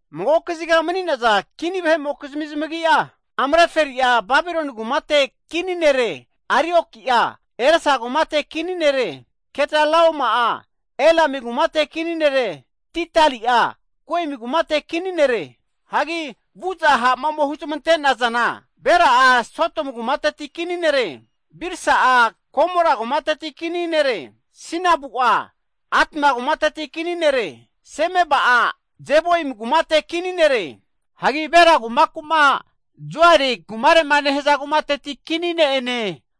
Mago kaziga mani'naza kva vahe'mokizmi zamagi'a, Amrafeli'a Babiloni kumateti nere. Arioki'a Elasa kumateti nere. Kedolaoma'a Elami kumateti nere. Tidali'a Goimi kumateti' nere. Hagi vu'za ha' ome huzmante'nazana Bera'a Sodomu kumate kini nere. Birsa'a Gomora kumate kini nere. Sinabu'a Adma kumate kini nere. Semeba'a Zeboimi kumate kini nere. Hagi Bela, kumakura Zoarie nehza kumateti kinie.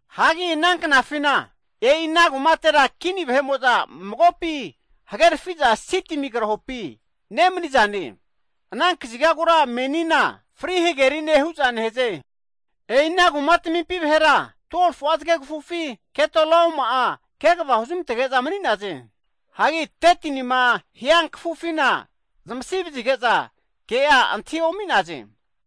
Ana knafi e'i ana kumatera kini vahe'mo'za magopi hagerfi'za Sidimi krahopi mani'naze. Ana kazigagura menia Kragefe Hgerine (Dead Sea), hu'za nehaze. E'i ana veamo'za 12fu'a zgegfufina Kedolaoma kvafi mani'naze. Hagi 13tinima hiankfufina zamasi vazige'za ke'a antahi omi'naze.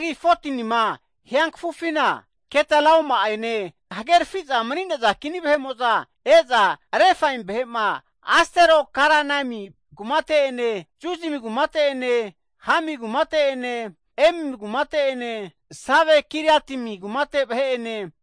14tinima hiankfufina Kedolaoma ene hagerfiza mani'naza kini vahe'mo'za e'za zamahe anati'naze. Refaim e'i Astero-karnaimi kumate vahe'ene, Zuzim e'i Hami kumate vahe'ene, Emim e'i Save-Kiriataim kumate vahe'ene,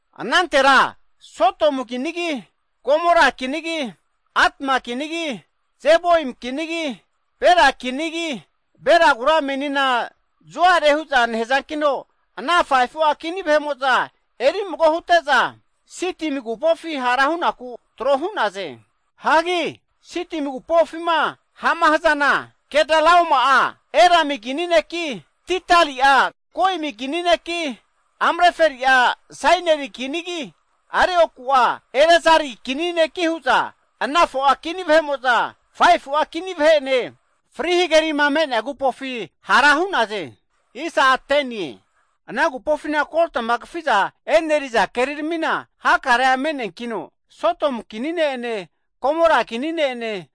Anantera Sodomu kinigi, Gomora kinigi, Adma kinigi, anati'naze. Zeboim kinigi, Bela kinine, Belagura menina Zoari huza nehzankino, ana fu'a 5fu'a kini vahe'mo'za eri mago hute'za Sidim agupofi hara hunaku tro hu'naze (Dead Sea). Sidim agupofima ha'ma hzana, Kedolaoma'a Elami kini neki, Tidali'a Goimi kini neki, Amrafeli'a Sainari kinigi, Arioku'a Elasari kinigi, huza ana 4'a kini vahe'mo'za 5fu'a kini vahe'ene kragefe hagerimofo agupofina hara hu'naze. (Ded Si). Ana agupofi hakare'a keri me'negeno Sodomu kini ne-ene Gomora kini ne'ene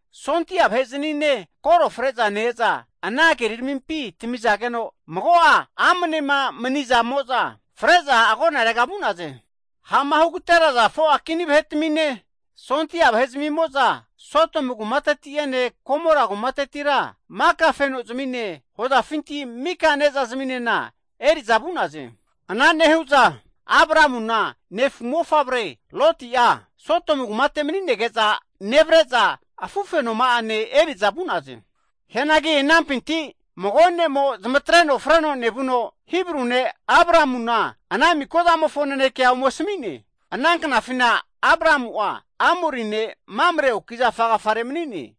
ha' vahe'znine koro fre'ne ne'ene kolta kerirami me'nefi tmizageno, mago'a amne mani'nazamo'za fre'za agonarega vu'naze. Ha'ma agaterea 4'a kinine ha' vahe'zmimo'za Sodomu kumateti'ene Gomora kumateti'ene mafka'za zimine hozafinti mika ne'za zimine eri'za vu'naze. Eri'za nevu'za Abramu negna mofavre Lotina Sodomu kumate mani'nege'za nege'za azeri'za afufenoma'ane vu'naze. Mago ne'mo zamatreno koro freno nevuno, Abramu Hibru ne' ome asmi'ne. Abramu'a Mamre Amorari ne'mofo oaki zafa agafare umani'ne.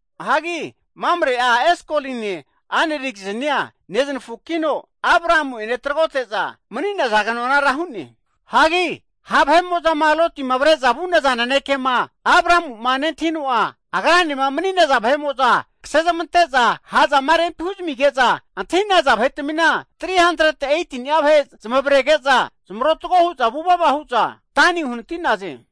Mamre'a Eskoline, Anel kizni'a neznafu kino Abramu ene tragote'naze. Lotima ha' vahe'mo'za avre'za vu'naza naneke Abramu'a nentahino, noma'afima kse zamantege'zama ha'zama rempi huzamige'za antahi'naza vahetmina 318ni'a nezmavreno zamarotgo hu'za vuva vuva hu'za Dani uhanati'naze.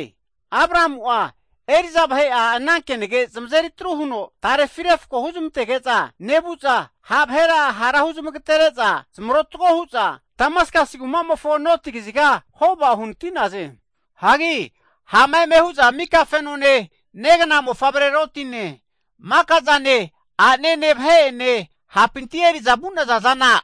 Abramu'a eri'za vahe'a kenage zamazeri atru huno refko huzmantege'za nevu'za, ha' vahera zamagatere'za zamarotgo hzage'za Hoba e'i Damaskas kumamofo noti kaziga uhnati'naze. Abramu'a maka fenone, negna mofavre Lotine, maka'zama ane, a'nene vahe ene ha'pinti eri'za vu'naza zana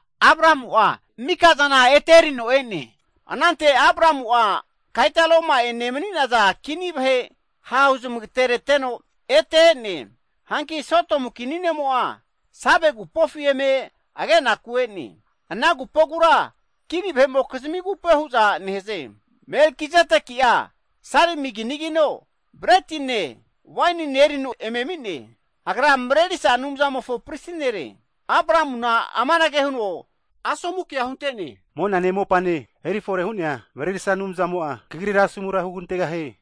mika eri'za ete e'naze. Anantera Abramu'a Kedolaoma ene mani'naza kini vahe ha' huzmagatereteno ete e'ne. Hanki Sodomu kini ne'mo'a Save agupofi eme agenaku ene, ana agupogura kini vahe'mokizmi agupoe nehaze. Melkizedeki'a Salemi kinigino, bretine, wainine erino eme ami'ne, agra Mrerisa Anumzamofo pris nere. Abramuna amanage huno asomu ke hunte'ne, monane mopane eri fore hu'nea Mrerisa Anumzamo kagrira asomu hugantegahie.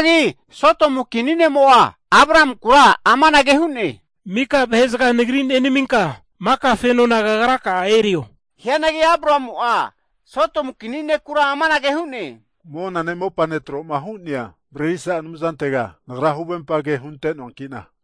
Sodomu kini ne'mo'a Abramunkura amanage hu'ne, mika vahe'zga nenaminka, mika fenona kagraka'a erio. Hianagi Abramu'a Sodomu kini netega amanage hu'ne, monane mopane tro'ma hu'nea Mrerisa Anumzantega nagra huvempage hunte'noankina,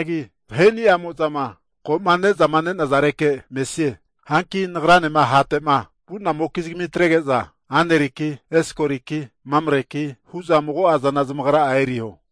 Nagrani'a mago'zana e'orisoanagi, vaheni'amo'zama ko'ma ne'naza ma'age'za erisnue. Hanki nagranema vu'nazamokizmi atrege'za Aneriki, Eskoliki, Mamreki hu'za mago'a zana zamagra'a eriho.